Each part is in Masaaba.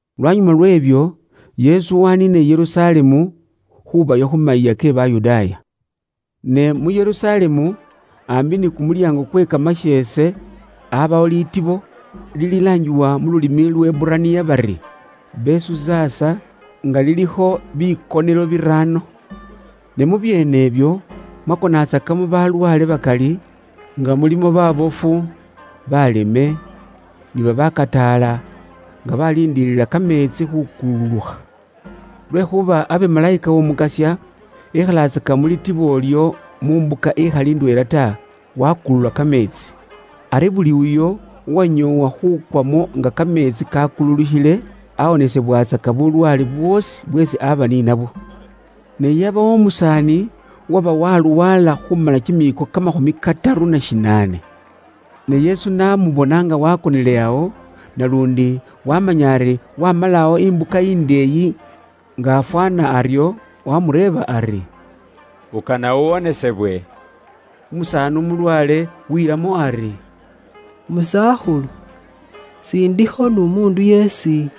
Lwanyuma lwe'byo, Yesu waniina i Yerusalemu, khubayo khu mayiiya ke Bayudaaya. Ne mu Yerusalemu, aambi ni kumulyaango kwe kamasheese aabawo liitibo, lililaangibwa mu lulimi Luheburaniya bari, “Besuzasa,” nga lilikho bikonelo biraano. Ne mu byeene ibyo, mwakonatsakamo balwaale bakali, nga mulimo baabofu, baleme, ni babakataala, nga baliindiilila kameetsi khuukululukha. Lwekhuuba abe Malayika w'Omukasya ekhatsaka mu litibo ilyo mu mbuka ikhali ndweela ta, waakulula kameetsi. Ari buli uyo uwanyoowa khuukwamo nga kameetsi kaakululukhile, awonesebwatsaka bulwaale bwoosi bweesi aaba ni nabwo. Ne yabayo umusaani uwaba walwaala khuumala kimiiko kamakhumi kataru na shinaane. Ne Yesu n'amubona nga waakonele awo, naluundi waamanya ari waamala awo imbuka indeeyi nga afwaana aryo, waamureeba ari, “Ukana uwonesebwe?” Umusaani umulwaale wiilamo ari, “Musakhulu, s'indikho n'umuundu yeesi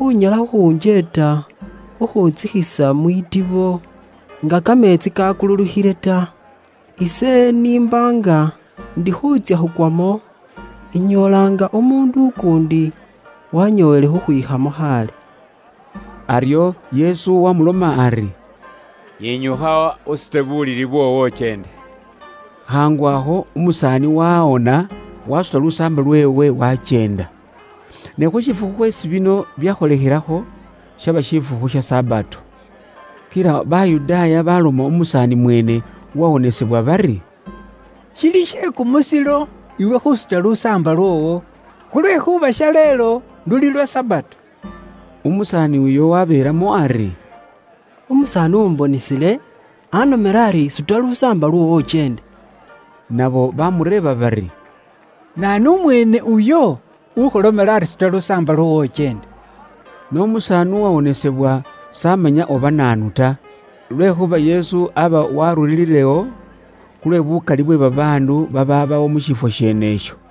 unyala khukhuunjeeta khukhuuntsikhisa mwitibo, nga kameetsi kaakululukhile ta. Ise n'imba nga ndi khuutsya khukwamo, inyoola nga umuundu ukuundi wanyoowele khukhwikhamo khaale.” Aryo Yesu waamuloma ari, “Yinyukha, usute bulili bwoowo, ukyeende.” Khaangu akho, umusaani waawona, waasuta lusaamba lweewe, waakyeenda. Ne khu shifukhu khweesi bino byakholekhelakho, shaba shifukhu sha Sabato. Kila Bayudaaya baloma umusaani mweene uwawonesebwa bari, “Shili she kumusilo iwe khuusuta lusaamba lwoowo, khulwekhuuba shaleelo luli lwa Sabato.” Umusaani uyo wabeelamo ari, “Umusaani uwumbonisile anomele ari suta lusaamba lwoowo ukyeende.” Nabo bamureeba bari, “Naanu umweene uyo, ukhulomele ari suta lusaamba lwoowo ukyeende?” Ne umusaani uwawonesebwa s'amanya oba naanu ta, khulwekhuuba Yesu aba warurilewo, khulwe bukali bwe babaandu babaabawo mu shifwo sheene isho.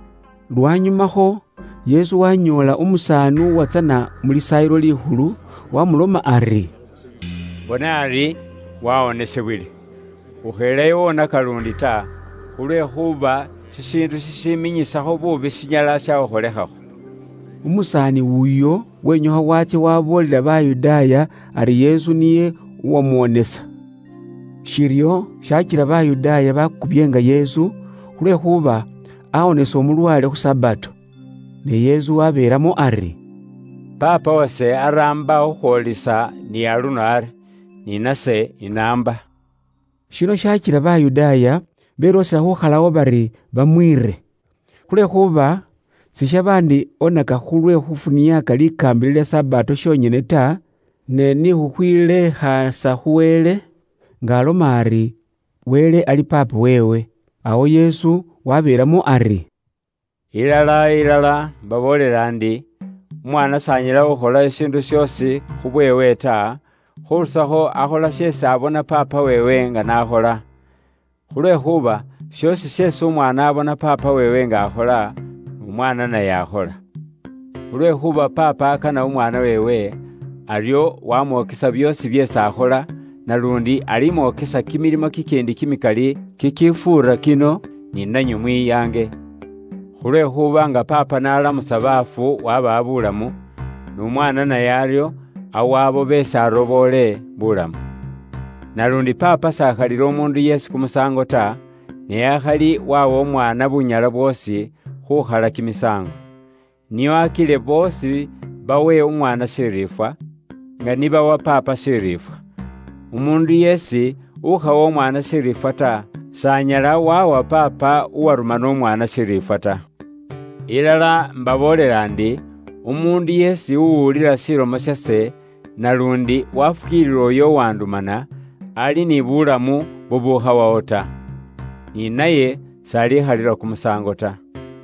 Lwanyumakho, Yesu waanyoola umusaani uwatsana mu Lisaayilo Likhulu, waamuloma ari, “Bona ari waawonisibwile. Ukheelayo wonaka luundi ta, khulwekhuuba shishiindu shishiminyisakho buubi shinyala shakhukholekhakho.” Umusaani uyo wenyukha waatsya waaboolela Bayudaaya ari Yesu niye uwamuwonesa. Shiryo shaakila Bayudaaya bakubyeenga Yesu, khulwekhuuba aawonesa umulwaale khu Sabato. Ne Yesu waabeelamo ari, “Paapa wase araamba khukhwoolisa ni aluno ari, ni nase inaamba.” Shino shaakila Bayudaaya beloosela khuukhalawo bari bamwiire. Khulwekhuuba sishaba ndi oneka khulwe khufuniaaka likaambila lya Sabato shonyene ta, ne ni khukhwiileekhaasa khu Wele, nga aloma ari Wele ali Paapa weewe. Awo Yesu wabeelamo ari, “Ilala, ilala, imbaboolela ndi, Umwaana s'anyala khukhola shishiindu shoosi khubweewe ta, khurusakho akhola sheesi abona Paapa weewe nga n'akhola. Khulwekhuuba shoosi sheesi umwaana abona Paapa weewe nga akhola, n'Umwaana naye akhola. Khulwekhuuba Paapa akana umwaana weewe, aryo wamwokesa byoosi byeesi akhola, naluundi alimwokesa kimilimo kikiindi kimikali kikifuura kino, ni nanywe mwiyange. Khulwekhuuba nga Paapa n'alamusa baafu wabawa buulamu, n'umwaana naye aryo awa abo beesi aroboole buulamu. Naluundi Paapa s'akhalila umuundu yeesi kumusaango ta, ne akhali wawa Umwaana bunyala bwoosi, khukhala kimisaango. Nio akile boosi bawe Umwaana shiriifwa, nga ni bawa Paapa shiriifwa. Umuundu yeesi ukhawa Umwaana shiriifwa ta, s'anyala wawa Paapa uwarumana Umwaana shiriifwa ta. “Ilala imbaboolela ndi, umuundu yeesi uwulila shilomo shase, naluundi waafukiilila uyo uwandumana, ali ni buulamu bubukhawawo ta. Ni naye sibali mukhalila kumusaango ta.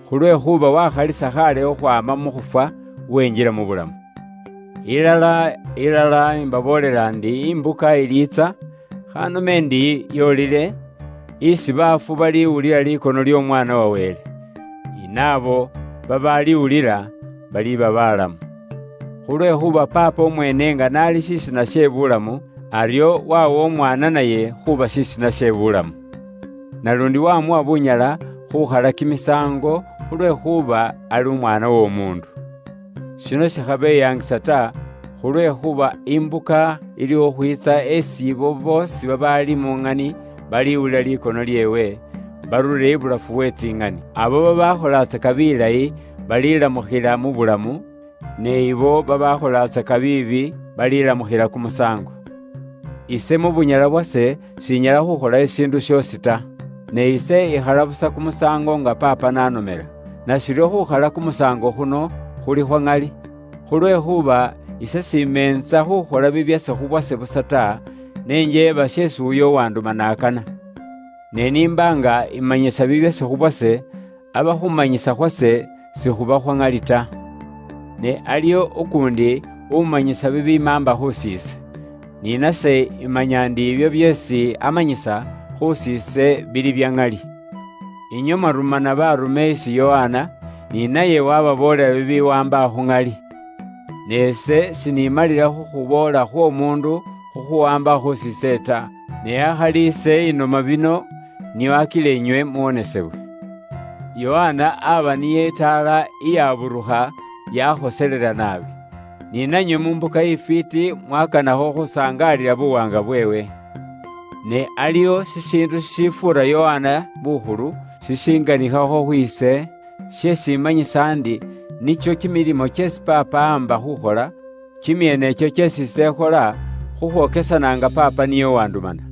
Khulwekhuuba waakhalisa khaale khukhwaama mu khufwa, wenjila mu bulamu. Ilala, ilala, imbaboolela ndi imbuka iliitsa, khanome ndi yoolile, isi baafu baliwulila likono ly'Omwaana wa Wele. Ni naabo babaaliwulila, baliba balamu. Khulwekhuuba Paapa umweene nga n'ali shisina she buulamu, aryo wawa Umwaana naye khuuba shisina she buulamu, Naluundi wamuwa bunyala khukhala kimisaango, khulwekhuuba ali Umwaana w'Omuundu. Shino shikhabeyangisa ta, khulwekhuuba imbuka ili khukhwiitsa esi abo boosi babaali mu ŋani baliwulila likono lyeewe, barure ibulafu we tsiŋani. Abo babaakholatsaka bilayi balilamukhila buulamu, ne abo babaakholatsaka biibi, balilamukhila kumusaango. “Ise mu bunyala bwase shinyala khuukhola shishiindu shoosi ta. Ne ise ikhala busa kumusaango nga Paapa n'anomela. Nashiryo khuukhala kumusaango khuno khuli khwa ŋali, khulwekhuuba ise s'imeentsa khuukhola bibyase khu bwase busa ta, ne njeeba sheesi uyo uwandumana akana. Ne n'imba nga imanyisa bibyase khubwase, aba khuumanyisa khwase sikhuba khwa ŋali ta. Ne aliwo ukuundi umanyisa bibimaamba khus'ise, ni nase imanya ndi ibyo byeesi amanyisa khus'ise bili bya ŋali. Inywe mwarumana baarume isi Yokana, ni naye waababoolela bibiwaamba khu ŋali. Ne ise sinimalila khukhuboola khw'omuundu khukhuwaamba khus'ise ta, ne akhali ise inoma bino nio akile inywe muwonesebwe. Yokana aba niye itaala iyaburukha yakhoselela naabi. Ni nanywe mu mbuka ifwiiti mwakanakho khusangaalila buwaanga bweewe. Ne aliwo shishiindu shishifuura Yokana bukhulu shishinganikhakho khwiise, sheesi imanyisa ndi nikyo kimilimo kyeesi Paapa amba khukhola, kimyeene ikyo kyeesi ise ikhola, khukhwokesana nga Paapa niye uwandumana.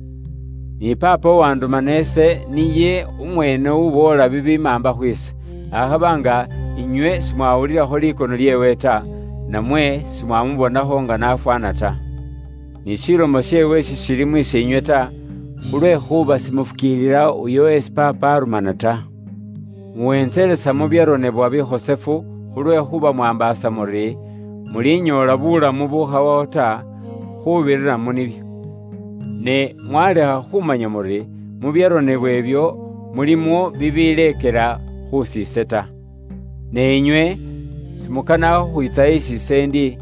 Ni Paapa uwandumana ise niye umweene uboola bibimaamba khwiise, akhaba nga inywe simwawulila likono lyeewe ta, namwe simwamubonakho nga n'afwaana ta. Ni shilomo sheewe sishili mus'iinywe ta, khulwekhuuba simufukiilila uyo esi Paapa arumana ta. “Muwentselesa mu byaronebwa bikhosefu khulwekhuuba mwaambaasa muri, mulinyoola buulamu bubukhawawo ta, khuubirira mu nibyo. Ne mwalekha khumanya muri mu byaronebwa ibyo, mulimo bibileekela khus'ise ta. Ne inywe simukana khukhwiitsa isi ise ndi,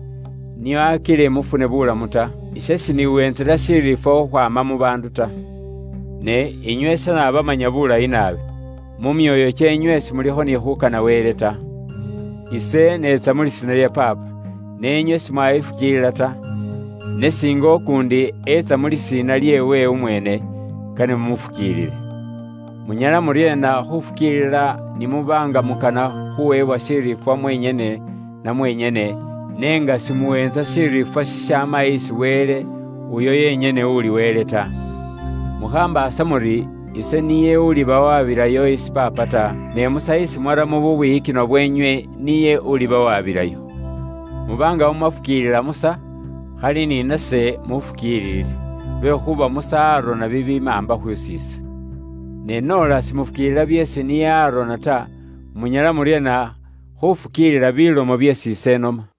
nio akile mufune buulamu ta. Ise shiniweentsela shiriifwa khukhwaama mu baandu ta. Ne inywe ise naabamanya bulayi naabi. Mu myoyo kyeenywe simulikho ni khuukana Wele ta. Ise neetsa mu lisiina lya Paapa, ne inywe simwayifukiilila ta. Ne singa ukuundi etsa mu lisiina lilyeewe umweene, kane mumufukiilile. Munyala muryeena khuufukiilila ni muba nga mukana khuwebwa shiriifwa mwenyene na mwenyene, ne nga simuweentsa shiriifwa shishaama isi Wele, uyo yenyene uli Wele ta? “Mukhambaasa muri ise niye ulibawabilayo isi Paapa ta. Ne Musa isi mwaramo bubwiyikinwa bwenywe niye ulibawabilayo. Muba nga mumwafukiilila Musa, khali ni nase mufukiilile, lwekhuuba Musa arona bibimaamba khus'ise. Ne noola simufukiilila byeesi niye arona ta, munyala muryeena khufukiilila bilomo byeesi ise inoma?”